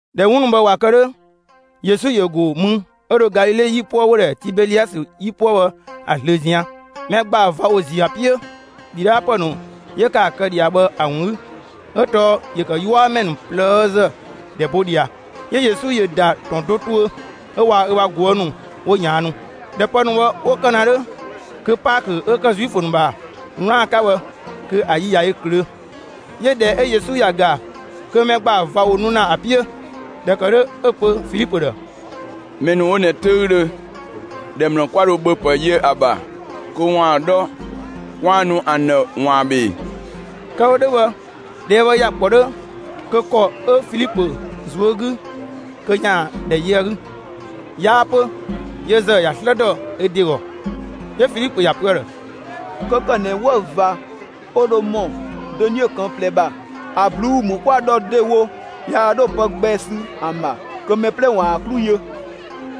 ꞊Dhɛ 'wun ‑nu bhë ꞊wa kë 'dhö, Yesu ‑yö ‑go mü 'ö dho Galile 'yipuë ('wo‑ ‑dhɛ Tibeliasë 'yipuë bhë) ‑a ꞊zlöö ꞊zian'. Mɛ ‑gbaa ꞊va ‑wo ‑ziö ‑a 'piö ‑dhidhaapë ‑nu 'yö ‑kë ‑a kë ꞊dhia bhë ‑a ‑wun 'gü, 'ö tɔɔ ‑yö ‑kë 'yuamɛ ‑nu ꞊plëëzë ‑dhɛ bo ꞊dhia. 'Yö Yesu ‑yö ‑da ‑tɔn do tuö, 'ö waa‑ ö ‑bha ꞊guë' ‑nu 'wo ꞊yaannu. ꞊Dhɛ pë ‑nu bhë 'wo kë ‑na 'dhö, kö Paakö 'ö ‑kë Zuifö ‑nu ‑bha 'wlaan‑ 'ka bhë, kö ‑a yi ꞊ya yö ꞊klöö'. 'Yö ‑dhɛ 'ö Yesu ‑ya ‑ga kö mɛ ‑gbaa ꞊va ‑wo nu ‑na ‑a 'piö; ꞊dhɛ ‑kë 'dhö 'ö‑ pö Filipö ‑dhë: «Mɛ ‑nu 'wo ꞊nɛ 'töüdhö, ‑dhɛ ‑mlë 'kwa dho ‑bhöpë yö ‑a ‑bha kö 'kwaan‑ 'dhɔ 'kwaan‑ nu ‑an ‑dhë ‑waan ‑bhö ‑ee?» Kë‑ wo 'dhö bhë, ꞊dhɛɛ' bhë ‑ya ‑kpɔ 'dhö kö ‑kɔ 'ö‑ 'ka Filipö ꞊zuö' 'gü kö ‑yaan ‑dhɛ yö ‑a 'gü; 'yaa 'pö, yö ‑zë ‑ya 'slë ‑dɔ ö ‑de ‑gɔ. 'Yö Filipö ‑ya pö ‑a ‑dhë: «'Kö ‑kë ꞊nɛ 'wëü‑ ꞊va 'ö dho ‑mɔ dönie ꞊këng' ꞊plɛ ‑bha ‑a ꞊bluu'‑ ‑mü 'kwa‑ ‑dhɔ ‑dewo, yaa 'dho pë gbɛ sü ‑an ‑bha, kö mɛ 'plɛ ‑waan ‑a 'klu yö.»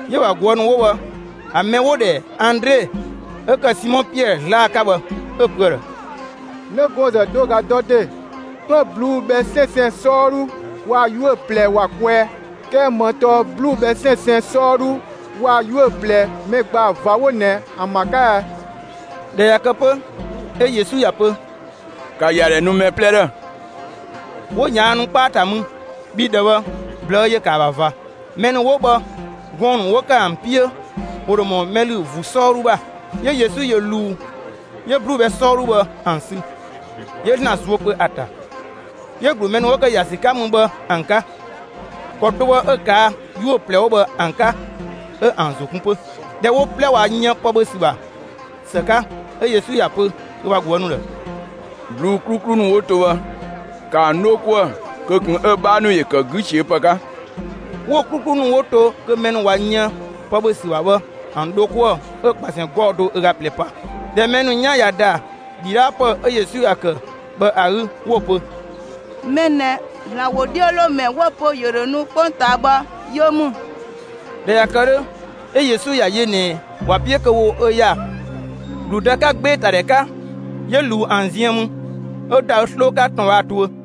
'Yö‑ ‑bha ꞊guë' ‑nu 'wo bhë, ‑a mɛ 'wo‑ ‑dhɛ Andre 'ö ‑kë Simɔ Piɛɛ 'zlaa‑ 'ka bhë, 'ö‑ pö ‑a ‑dhë: «'Nëgɔɔnzë do ꞊ga 'ö dɔ ‑de, 'klën ꞊bluu'‑ bhɛ 'sɛnsɛn 'sɔɔdhu waa‑ 'yuö‑ ꞊plɛ ‑wa kwɛɛ. 'Kɛɛ ‑më tɔɔ ꞊bluu'‑ bhɛ 'sɛnsɛn 'sɔɔdhu waa‑ 'yuö‑ ꞊plɛ mɛ ‑gbaa ꞊va 'wo ꞊nɛ ‑an ‑bha 'ka ɛ?» ꞊Dhɛ ꞊ya kë 'pö, 'ö Yesu ‑ya pö: «‑Ka ‑yadhɛ nu mɛ 'plɛ ‑dhë!» 'Wo ꞊yaannu 'kpaa ‑ta mü, bhii ‑dhɛ bhë ꞊blëë' ‑yö ‑kë ‑a ‑bha ꞊va. Mɛ ‑nu 'wo bhë gɔɔn‑ ‑nu 'wo ‑kë ‑an 'piö ‑wo ‑dho ‑mɔ mɛ ‑lü ‑vuu 'sɔɔdhu ‑bha. 'Yö Yesu ‑yö ꞊luu 'yö ꞊bluu'‑ bhɛ 'sɔɔdhu bhë ‑an sü. 'Yö ‑Zlan zuö pö ‑a ‑ta; 'yö‑ ‑glu mɛ ‑nu 'wo ‑kë ‑ya ‑sü 'ka mü bhë ‑an 'ka. ‑Kɔ do bhë 'ö‑ ꞊kaa' 'yuö‑ ꞊plɛ 'wo bhë ‑an 'ka 'ö ‑an ‑zo kun 'pö. ꞊Dhɛ wo 'plɛ ꞊wa yën pë ‑bhö ‑sü ‑bha ‑së 'ka, 'ö Yesu ‑ya pö ö ‑bha ꞊guë' ‑nu ‑dhë: «꞊Bluu'‑ 'kluklu ‑nu 'wo to bhë, ‑ka ‑an 'dho 'kuë‑ kö ꞊kun 'ö‑ 'bhaa ‑yö ‑kë 'gü ꞊siö'‑ ‑pë 'ka.» 'Wo‑ 'kluklu ‑nu 'wo to kö mɛ ‑nu ꞊wa yën pë ‑bhö ‑sü ‑bha bhë ‑an dho 'kuë‑, 'ö ꞊kpasɛn 'gɔɔ‑ do ö ꞊ga ꞊plɛ pa. ꞊Dhɛ mɛ ‑nu 'yan ꞊ya ‑da ‑dhidhaapë 'ö Yesu ‑ya ‑kë bhë ‑a 'gü, 'wo‑ pö: «Mɛ ꞊nɛ, ‑Zlan ‑wodhiölomɛ 'wo‑ pö ‑yö ‑dho nu 'kpongtaa bhë, yö ‑mü!» ꞊Dhɛ ꞊ya kë 'dhö, 'ö Yesu ꞊yaa‑ yö ꞊nɛ ‑wa 'piö kö 'wo ö ‑ya ‑gludë 'ka 'gbeetadhɛ 'ka, 'yö ꞊luu ‑an ziën mü, 'ö ‑da ö 'sloo 'ka ‑tɔn bhë ‑a tuö.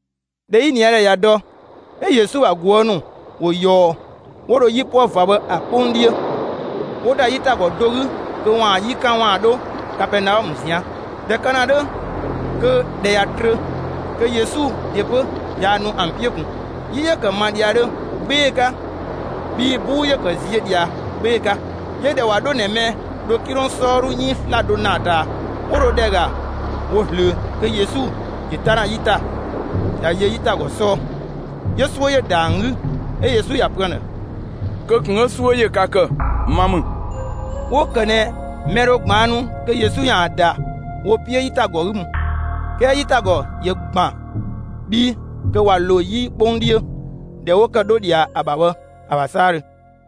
꞊Dhɛ 'yiniadhɛ ꞊ya dɔ, 'ö Yesu ‑bha ꞊guë' ‑nu ‑wo ꞊yɔɔ, 'wo dho 'yipuë ꞊va bhë ‑a 'kpong 'dhiö. 'Wo ‑da 'yitagɔ do 'gü kö ‑waan 'yi 'kan ‑waan 'dho Kapɛɛnaɔmë ꞊zian'. ꞊Dhɛ kë ‑na 'dhö kö ‑dhɛ ꞊ya trö, kö Yesu ‑de 'pö yaa nu ‑an 'piö ꞊kun. 'Yi ‑yö ‑kë ‑ma ꞊dhiadhö 'gbee‑ 'ka, bhii 'buu ‑yö ‑kë ziö ꞊dhia 'gbee‑ 'ka. 'Yö ꞊dhɛ ꞊wa 'dho ꞊nɛ mɛ‑ dho 'kilong 'sɔɔdhu 'iin 'slado ‑naa ‑ta, ('wo dho ‑dhɛ ‑ga wo ꞊zlöö), kö Yesu ‑yö 'ta ‑na 'yi ‑ta, ꞊ya yö 'yitagɔ 'sɔɔ. 'Yö 'suö ‑yö ‑da ‑an 'gü. 'Ö Yesu ‑ya pö ‑an ‑dhë: «Kö ꞊kun 'ö 'suö ‑yö ka ‑kë, ma ‑mü!» 'Wo‑ ‑kë ꞊nɛ mɛ dho ꞊gbaannu kö Yesu ‑yaan ‑da wo 'piö 'yitagɔ 'gü mü. 'Kɛɛ 'yitagɔ ‑yö ‑gban 'ö bhii kö ꞊wa ‑lo 'yi 'kpong 'dhiö, ‑dhɛ 'wo ‑kë 'dho ꞊dhia ‑a ‑bha bhë ‑a ‑bha 'saadhö.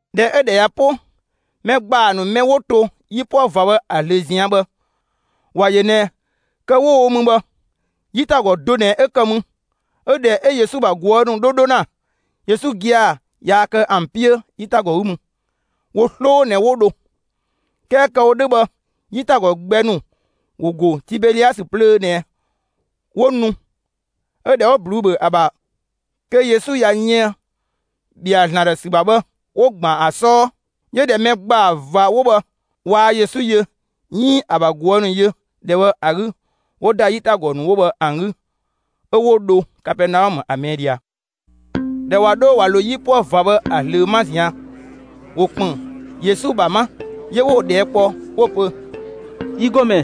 ꞊Dhɛ 'ö ‑dhɛ ꞊ya 'po, mɛ ‑gbaa ‑nu mɛ 'wo to 'yipuë ꞊va bhë ‑a ꞊zlöö ꞊zian' bhë, ‑wa ‑yö ꞊nɛ kë 'wo‑ wo mü bhë, 'yitagɔ do ꞊nɛ 'ö ‑kë mü. 'Ö ꞊dhɛ 'ö Yesu ‑bha ꞊guë' ‑nu 'dho 'dho ‑na, Yesu gia‑ yaa kë ‑an 'piö 'yitagɔ 'gü mü, wo 'sloo ꞊nɛ 'wo dho. 'Kɛɛ kë‑ wo 'dhö bhë, 'yitagɔ gbɛ ‑nu ‑wo ‑go Tibeliasë plöö ꞊nɛ 'wo nu 'ö ‑dhɛ 'wo ꞊bluu'‑ ‑bhö ‑a ‑bha kö Yesu ꞊ya yën ‑bhɛa ‑Zlan ‑dhë ‑sü 'ka bhë 'wo ‑gban ‑a 'sɔɔ. 'Yö ꞊dhɛ mɛ ‑gbaa ꞊va 'wo bhë waa Yesu yö 'iin ‑a ‑bha ꞊guë' ‑nu yö ‑dhɛ bhë ‑a 'gü, 'wo ‑da 'yitagɔ ‑nu 'wo bhë ‑an 'gü 'ö 'wo dho Kapɛɛnaɔmë ‑a ꞊mɛɛ' ꞊dhia. ꞊Dhɛ ꞊wa 'dho ꞊wa ‑lo 'yipuë ꞊va bhë ‑a ꞊zlöö 'ma ꞊zian', ‑wo ‑kpën Yesu ‑bha 'ma; 'yö 'wo‑ ꞊dhɛɛ' kpɔ 'wo‑ pö: «Yi ‑Gɔmɛ,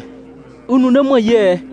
ü ‑nu 'nö ‑më yië ꞊ɛɛ?»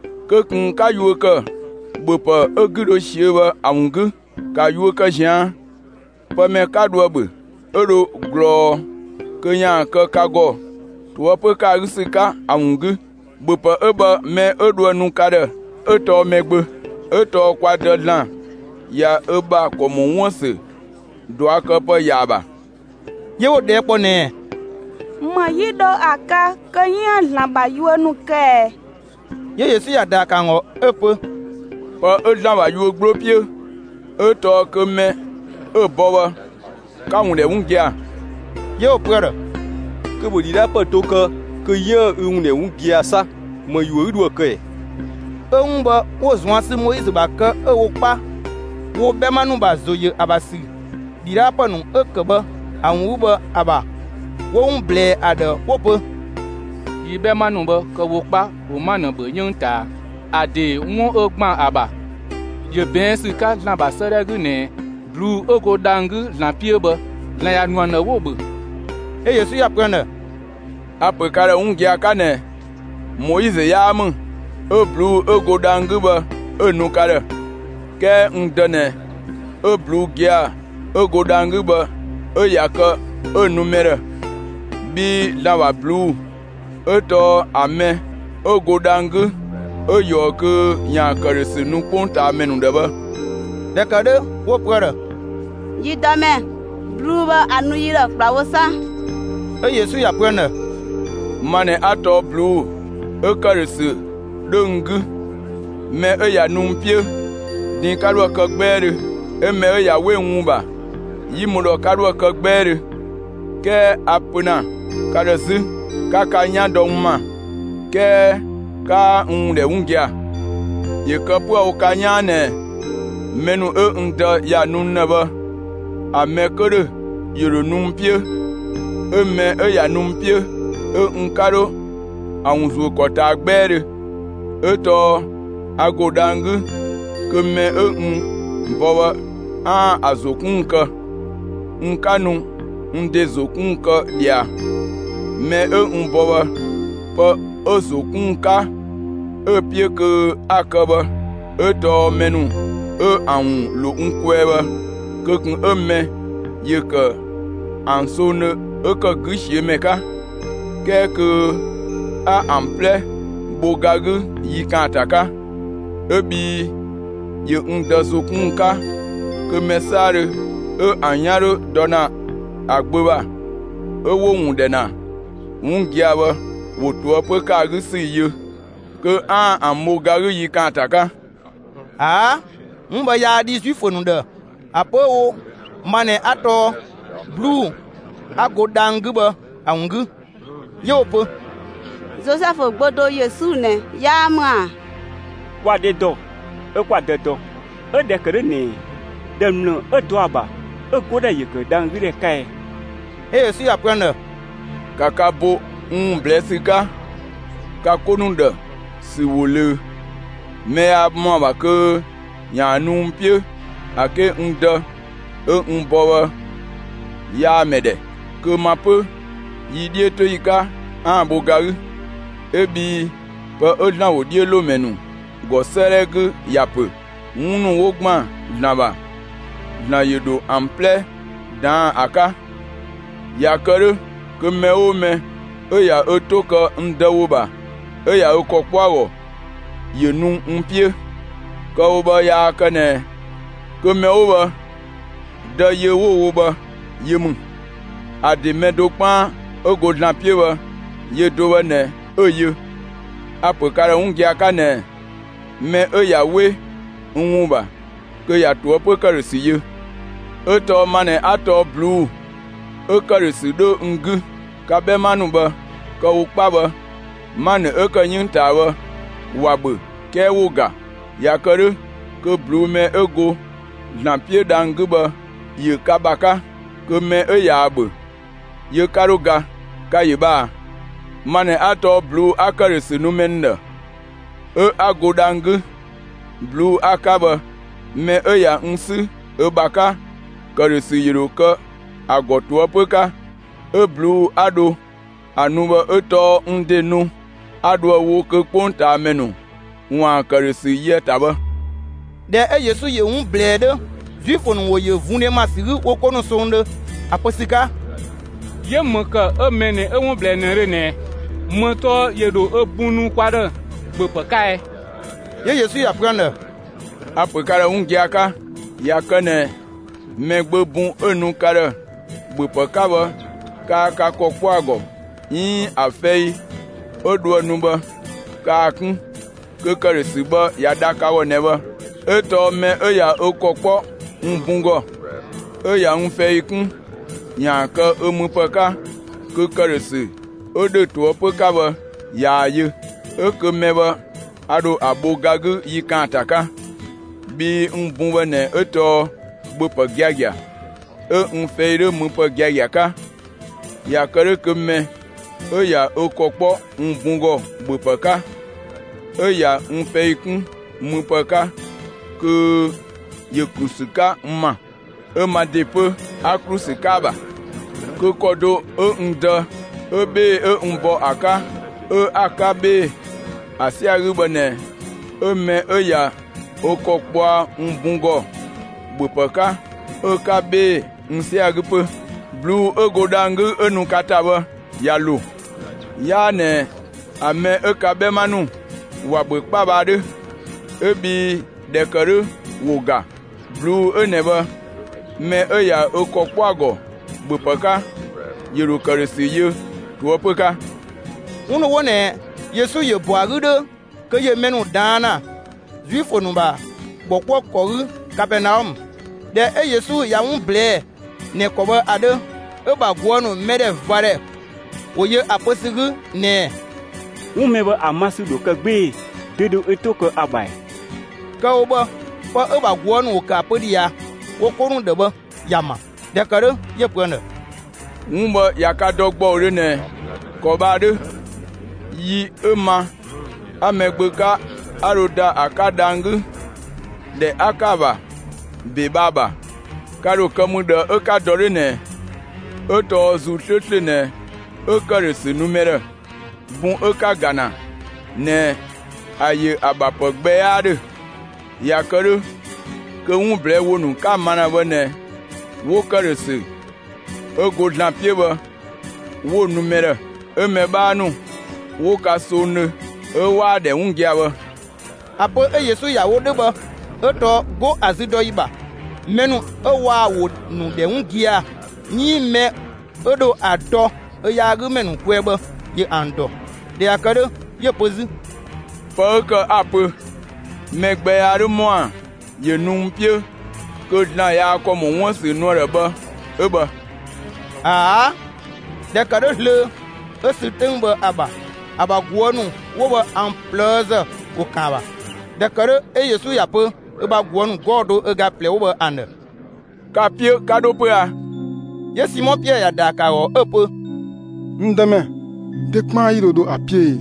Kö ꞊kun 'ka yuö ‑kë ‑bhöpë 'ö‑ 'gü dho ꞊siö'‑ bhë ‑a ‑wun 'gü; ‑ka yuö kë ꞊zian' pë mɛ 'ka dhoë‑ ‑bhö, 'ö dho ꞊glɔɔ kö ‑yaan kë ka ‑gɔ ꞊toëpö ‑kë ‑a 'gü ‑sü 'ka ‑a ‑wun 'gü. ‑Bhöpë 'ö bhë mɛ 'ö dhoë‑ nu ka ‑dhë 'ö tɔɔ Mɛgbö; 'ö tɔɔ kwa Dë ‑Zlan ꞊ya ö ‑bha ‑kɔ ‑mɔ 'wuën‑ ‑sü ꞊duakëpë ‑ya ‑a ‑bha.» 'Yö 'wo‑ ꞊dhɛɛ' kpɔ ꞊nɛɛ: «‑Më 'yi dho ‑a kë kö 'yiën‑ ‑Zlan ‑bha yuö ‑nu kë ꞊ɛɛ?» 'Yö Yesu ‑ya ‑daa ‑kë ‑an ‑gɔ 'ö‑ pö: «Pë 'ö ‑Zlan ‑bha yuö 'gbloo 'piö, 'ö tɔɔ kö mɛ 'ö‑ bɔ bhë, 'ka‑ ‑wun ‑dhɛ 'wun gia‑.» 'Yö 'wo‑ pö ‑a ‑dhë: «Kö ‑bhö ‑dhidhaapë do kë kö 'yiën‑ ü ‑wun ‑dhɛ 'wun gia‑ 'sa! ‑Më ‑yuö 'ü dhoë‑ kë ꞊ɛɛ?» 'Ö ('wun bhë, 'wo‑ ꞊zuan' sü Moizö ‑bha kë 'ö‑ wo 'kpa wo 'bhɛma ‑nu ‑bha ‑zo ‑yö ‑a ‑bha ‑mɛ 'ka ‑sü, ‑dhidhaapë ‑nu 'ö ‑kë bhë ‑a ‑wun 'gü bhë ‑a ‑bha) 'wo‑ ‑wun ꞊blɛɛ ‑a ‑dhë, 'wo‑ pö: «Yi 'bhɛma ‑nu bhë, kë‑ wo 'kpa, ‑wo 'manë ‑bhö 'yënng ꞊taa. ‑A ‑dee 'wun 'ö ‑gban ‑a ‑bha, ‑yö ꞊bɛɛn' ‑sü 'ka ‑Zlan ‑bha 'sëëdhɛ 'gü ꞊nɛɛ: ꞊Bluu'‑ 'ö go dhang‑ 'gü ‑Zlan 'piö bhë, ‑Zlan ‑ya ‑nu ‑an ‑dhë 'wo‑ ‑bhö.» 'Ö Yesu ‑ya pö ‑an ‑dhë: «A‑ ‑pö ka ‑dhë giagia 'ka ꞊nɛ Moizö 'yaa ‑mü 'ö ꞊bluu'‑ 'ö go dhang‑ 'gü bhë 'ö‑ nu ka ‑dhë, 'kɛɛ n Dë ꞊nɛ 'ö ꞊bluu'‑ gia‑ 'ö go dhang‑ 'gü bhë 'ö ꞊ya kë 'ö‑ nu mɛ ‑dhë; bhii ‑Zlan ‑bha ꞊bluu'‑ 'ö tɔɔ ‑a mɛ 'ö go dhang‑ 'gü 'ö ꞊yɔɔ kö ‑yaan ‑këdhösü nu 'kpongtaamɛ ‑nu ‑dhë bhë.» ꞊Dhɛ ‑kë 'dhö, 'wo‑ pö ‑a ‑dhë: «Yi Dëmɛ, ꞊bluu'‑ bhë ‑a nu yi ‑dhë ‑kplawo 'sa.» 'Ö Yesu ‑ya pö ‑an ‑dhë: «Ma ꞊nɛ 'a tɔɔ ꞊bluu'‑ 'ö ‑këdhösü 'dhö n 'gü. Mɛ 'ö ꞊ya nu n 'piö, din 'ka 'dhoë‑ kë 'gbɛɛdhö, 'ö mɛ 'ö ꞊ya 'we n ‑wun ‑bha, 'yi mü ‑dhɔ 'ka 'dhoë‑ kë 'gbɛɛdhö. 'Kɛɛ a‑ pö ‑na ka ‑dhë 'zü: 'Ka ka 'yan dɔ n ‑ma, 'kɛɛ 'kaa n ‑wun ‑dhɛ 'wun gia‑. ‑Yö kë 'pö‑ wo ka 'yaan ꞊nɛ mɛ ‑nu 'ö n Dë ‑ya nu n ‑dhë bhë, ‑a mɛ 'kö ‑dhö, ‑yö ‑dhö nu n 'piö; 'ö mɛ 'ö ꞊ya nu n 'piö, 'ö n 'ka 'dho ‑a ‑wun ‑zuö ‑kɔ ꞊taa 'gbɛɛdhö; 'ö tɔɔ a ‑go dhang‑ 'gü kö mɛ 'ö n bɔ bhë, 'aan‑ ‑a ‑zo 'kun ‑wun kë; n 'ka nu n ‑de ‑zo 'kun ‑wun kë ꞊dhia. Mɛ 'ö n bɔ bhë, pë 'ö‑ ‑zo 'kun ‑wun 'ka 'ö‑ 'piö kö 'a‑ kë bhë 'ö tɔɔ mɛ ‑nu 'ö ‑an ‑wun ‑lo n kwɛɛ bhë, kö ꞊kun 'ö mɛ ‑yö ‑kë ‑an songdhö 'ö ‑kë 'gü ꞊siö' ‑mɛ 'ka, 'kɛɛ kö 'a ‑an 'plɛ bho ga 'gü yi ‑kaanta 'ka. 'Ö bhii ‑yö n Dë ‑zo 'kun ‑wun 'ka kö mɛ 'saadhö 'ö ‑an 'yan 'dhö dɔ ‑na ‑a Gbö ‑bha, 'ö 'wo‑ ‑wun ‑dhɛ ‑na 'wun gia‑ bhë, ‑wo ꞊toëpö ‑kë ‑a 'gü ‑sü yö kö 'aan‑ ‑an bho ga 'gü yi ‑kaanta 'ka.» ꞊Aa', 'wun bhë yaa dhi Zuifö ‑nu ‑dhë ‑a pö 'ö‑ wo ma ꞊nɛ 'a tɔɔ ꞊bluu'‑ 'a go dhang‑ 'gü bhë ‑a ‑wun 'gü. 'Yö 'wo‑ pö: «Zozɛfu gbö do Yesu ꞊nɛ 'yaa ‑mü ‑a? Kwa‑ dhe ‑dɔ 'ö 'kwa‑ dë dɔ; 'ö ꞊dhɛ ‑kë 'dhö ꞊nɛ ‑dhɛ ‑mlë 'ö dɔ ‑a ‑bha 'ö‑ 'godhɛ ‑yö ‑kë dhang‑ 'gü ‑dhɛ 'ka ɛɛ?» 'Ö Yesu ‑ya pö ‑an ‑dhë: «‑Ka ka bo n ‑wun ꞊blɛɛ' ‑sü 'ka ka 'ko ‑nu ‑dhë ‑sü ‑wo ꞊löö; mɛ yaa ‑mɔa ‑bha kö ‑yaan nu n 'piö ‑a 'ke n Dë 'ö n bɔ bhë, yaa‑ mɛ ‑dhɛ, kö ma 'pö, yi 'dhiötoyi 'ka, 'aan‑ bho ga 'gü. 'Ö bhii pë 'ö ‑Zlan ‑wodhiölomɛ ‑nu ‑gɔ 'sëëdhɛ 'gü ‑ya ‑pö: 'Wun ‑nu 'wo ‑gban ‑Zlan ‑bha, ‑Zlan ‑yö ‑dho ‑an 'plɛ ꞊daan' ‑a 'ka. ꞊Ya kë 'dhö kö mɛ 'oo mɛ 'ö ꞊ya ö 'to kë n Dë ‑wo ‑bha 'ö ꞊ya ö ‑kɔ kpɔ ‑a ‑gɔ, ‑yö nu n 'piö. Kë‑ wo bhë yaa kë ꞊nɛ kö mɛ 'wo bhë, Dë yö 'wo‑ wo bhë yö ‑mü. ‑A ‑de mɛ do 'kpaan 'ö go ‑Zlan 'piö bhë, yö do bhë ꞊nɛ 'ö‑ yö. A‑ ‑pö ka ‑dhë 'wun gia‑ 'ka ꞊nɛ mɛ 'ö ꞊ya 'we n ‑wun ‑bha, kö ꞊ya ꞊toëpö ‑këdhösü yö. 'Ö tɔɔ ma ꞊nɛ 'a tɔɔ ꞊bluu'‑ 'ö ‑këdhösü 'dhö n 'gü. Ka 'bhɛma ‑nu bhë, kë‑ wo 'kpa bhë, 'manë 'ö ‑kë 'yënng ꞊taa bhë, ‑wa ‑bhö 'kɛɛ ‑wo ‑ga. ꞊Ya kë 'dhö, kö ꞊bluu'‑ mɛ 'ö go (‑Zlan 'piö) dhang‑ 'gü bhë ‑yö ka ‑bha 'ka; kö mɛ 'ö ꞊yaa‑ ‑bhö, yö 'ka 'dho ga. Ka‑ ‑yö bhë ꞊a! Ma ꞊nɛ 'a tɔɔ ꞊bluu'‑ 'a ‑këdhösü nu mɛ ‑nu ‑dhë, 'ö 'a go dhang‑ 'gü. ꞊Bluu'‑ 'a‑ 'ka bhë, mɛ 'ö ꞊ya n 'sü ö ‑bha 'ka, ‑këdhösü ‑yö ‑dho kë ‑a ‑gɔ ꞊toëpö 'ka. 'Ö ꞊bluu'‑ 'a dho ‑a nu bhë 'ö tɔɔ n ‑de nu 'a 'dhoë‑ wo kö 'kpongtaamɛ ‑nu ‑waan ‑këdhösü yö ‑a ‑ta bhë.» ꞊Dhɛ 'ö Yesu ‑yö 'wun ꞊blɛɛ 'dhö, Zuifö ‑nu ‑wo ‑yö vundhe ma ‑sü 'gü wo 'ko ‑nu songdhö ‑a pö ‑sü 'ka: «'Yö, ‑më ‑kë 'ö mɛ ꞊nɛ 'ö 'wun ꞊blɛɛ ꞊nëdhö ꞊nɛɛ? ‑Më tɔɔ ‑yö ‑dho ö bun nu kwa ‑dhë ‑bhöpë 'ka ɛ?» 'Yö Yesu ꞊ya pö ‑an ‑dhë: «A‑ ‑pö ka ‑dhë 'wun gia‑ 'ka, ꞊ya kë ꞊nɛ Mɛgbö bun 'ö nu ka ‑dhë ‑bhöpë 'ka bhë kaa ka ‑kɔ 'kpɔ ‑a ‑gɔ 'iin ‑a fɛi 'ö dhoë‑ nu bhë kaa‑ 'kun, kö ‑këdhösü bhë ꞊ya dha ka ‑gɔ ꞊nɛ bhë. 'Ö tɔɔ mɛ 'ö ꞊ya ö ‑kɔ kpɔ n bun ‑gɔ 'ö ꞊ya n fɛi kun ‑yaan kë ö müpë 'ka, kö ‑këdhösü 'ö ‑dhö ꞊toëpö 'ka bhë, ꞊yaa‑ yö; 'ö kö mɛ bhë a ‑dho ‑a ‑bho ga 'gü yi ‑kaanta 'ka. Bhii n bun bhë ꞊nɛ 'ö tɔɔ ‑bhöpë giagia, 'ö n fɛi 'dhö müpë giagia 'ka. ꞊Ya kë 'dhö kö mɛ 'ö ꞊ya ö ‑kɔ 'kpɔ n bun ‑gɔ ‑bhöpë 'ka 'ö ꞊ya n fɛi 'kun müpë 'ka kö ‑yö ‑klu ‑sü 'ka n ‑ma, 'ö ma ‑de 'pö, 'a ‑klu ‑sü 'ka ‑a ‑bha. Kö ‑kɔ do 'ö n Dë 'ö 'bhee‑ 'ö n bɔ ‑a 'ka 'ö 'a‑ 'ka 'bhee‑ ‑a 'sɛa‑ 'gü bhë ꞊nɛ 'ö mɛ 'ö ꞊ya ö ‑kɔ kpɔa n bun ‑gɔ ‑bhöpë 'ka 'ö‑ 'ka 'bhee‑ n sɛa‑ 'gü 'pö. ꞊Bluu'‑ 'ö go dhang‑ 'gü 'ö nu ka ‑ta bhë, ꞊ya ‑lo. 'Yaa ꞊nɛ ‑a mɛ 'ö ka 'bhɛma ‑nu ‑wa ‑bhö 'kpa bhë ‑a 'dhö, 'ö bhii ꞊dhɛ ‑kë 'dhö ‑wo ‑ga. ꞊Bluu'‑ 'ö ꞊nɛ bhë, mɛ 'ö ꞊ya ö ‑kɔ 'kpɔ ‑a ‑gɔ ‑bhöpë 'ka, ‑yö ‑dho ‑këdhösü yö ꞊toëpö 'ka.» 'Wun ‑nu 'wo ꞊nɛ Yesu ‑yö ‑bɔ ‑a 'gü 'dhö kö ‑yö mɛ ‑nu ꞊daan' ‑na Zuifö ‑nu ‑bha ‑bhɔkuëkɔ 'gü Kapɛɛnaɔmë. ꞊Dhɛ 'ö Yesu ꞊ya 'wun ꞊blɛɛ'‑ ꞊nɛ ‑kɔ bhë ‑a 'dhö, 'ö‑ ‑bha ꞊guë' ‑nu mɛdhɛvadhɛ ‑wo yö ‑a pö ‑sü 'gü ꞊nɛɛ: «'Wun mɛ bhë ‑a ma ‑sü ‑dho kë 'gbee‑; dö dho ö 'to kë ‑a ‑bha ‑ɛɛ?» Kë‑ wo bhë, pë 'ö‑ ‑bha ꞊guë' ‑nu ‑wo ‑kë ‑a pö ꞊dhia wo 'ko ‑nu ‑dhë bhë, ‑ya ‑ma. ꞊Dhɛ ‑kë 'dhö 'yö‑ pö ‑an ‑dhë: «'Wun bhë ꞊ya ka dɔ ‑gbɔudhö ꞊nɛ ‑kɔ bhë ‑a 'dhö, yi 'ö ma 'a Mɛgbö 'ka 'a dho ‑da ‑a 'ka dhang‑ 'gü, ‑dhɛ 'a ‑kë ‑a ‑bha ‑be bhë ‑a ‑bha, ka ‑dho kë mü ꞊dhë 'ö 'ka dɔ 'dhö ꞊nɛɛ? 'Ö tɔɔ ‑Zuu 'slööslö ꞊nɛ 'ö ‑këdhösü nu mɛ ‑dhë; bun 'ö 'ka‑ ‑ga ‑na ꞊nɛ, ‑a ‑yö ‑a ‑bha ‑pë gbɛ 'yaa 'dhö. ꞊Ya kë 'dhö kö 'wun ꞊blɛɛ' ‑wo ‑nu 'ka‑ ma bhë ꞊nɛ 'wo ‑këdhösü 'ö go ‑Zlan 'piö bhë 'wo‑ nu mɛ ‑dhë, 'ö mɛ 'bhaa ‑nu 'wo ka songdhö 'ö 'waa‑ ‑dhɛ 'wun gia‑ bhë.» ‑A pö 'ö Yesu ‑ya wo 'dhö bhë 'ö tɔɔ 'go ‑a züdɔyi ‑bha, mɛ ‑nu 'ö 'waa‑ ‑wo ‑nu ‑dhɛ 'wun gia‑ 'iin mɛ 'ö dho ö dɔ ö yaagümɛ ‑nu kwɛɛ bhë ‑yö ‑an dɔ. ꞊Dhɛ ꞊ya kë 'dhö, 'yö‑ pö 'zü: «Pë 'ö ‑kë 'a‑ pö mɛ gbɛ yaa 'dhö ‑mɔa ‑yö nu n 'piö kö ‑Zlan yaa‑ ‑kɔ ‑mɔ 'wuën‑ ‑sü nu ‑a ‑dhë bhë 'ö bhë.» ꞊Aa', ꞊dhɛ ‑kë 'dhö zlöö, 'ö sü 'töng bhë ‑a ‑bha, ‑a ‑bha ꞊guë' ‑nu 'wo bhë, ‑an ꞊plëëzë ‑wo ‑kan ‑a ‑bha. ‑Dhɛ ‑kë 'dhö, 'ö Yesu ‑ya pö ö ‑bha ꞊guë' ‑nu 'gɔɔ‑ do ö ga ꞊plɛ 'wo bhë ‑an ‑dhë: «Ka‑ 'piö 'ka 'dho 'pö a?» 'Yö Simɔ Piɛɛ ‑ya ‑daa ‑kë ‑a ‑gɔ 'ö‑ pö: «N Dëmɛ, dö 'kpaan 'yi dho dho ‑a 'piö ee?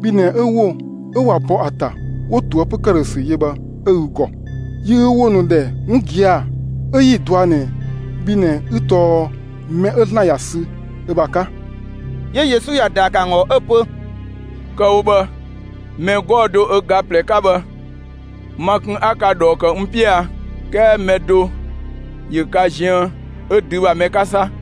Bhi ꞊nɛ 'ö ‑wo 'ö ꞊wa bɔ ‑a ‑ta 'wo ꞊toëpö ‑këdhösü yö bhë 'ö ü ‑gɔ. Yi ü ‑wo ‑nu ‑dhɛ 'wun gia‑ 'ö 'yi‑ dɔa ꞊nɛ bhi ꞊nɛ 'ü tɔɔ mɛ 'ö ‑Zlan ‑ya sü ö ‑bha 'ka.» 'Yö Yesu ‑ya ‑daa ‑kë ‑an ‑gɔ 'ö‑ pö: «Kë‑ wo bhë, mɛ 'gɔɔ‑ do ö ga ꞊plɛ 'ka bhë, ma kun 'a ka ꞊dhɔɔ ‑kë n 'piö a? 'Kɛɛ mɛ do ‑yö ka ziën 'ö dü ‑bha mɛ 'ka 'sa!»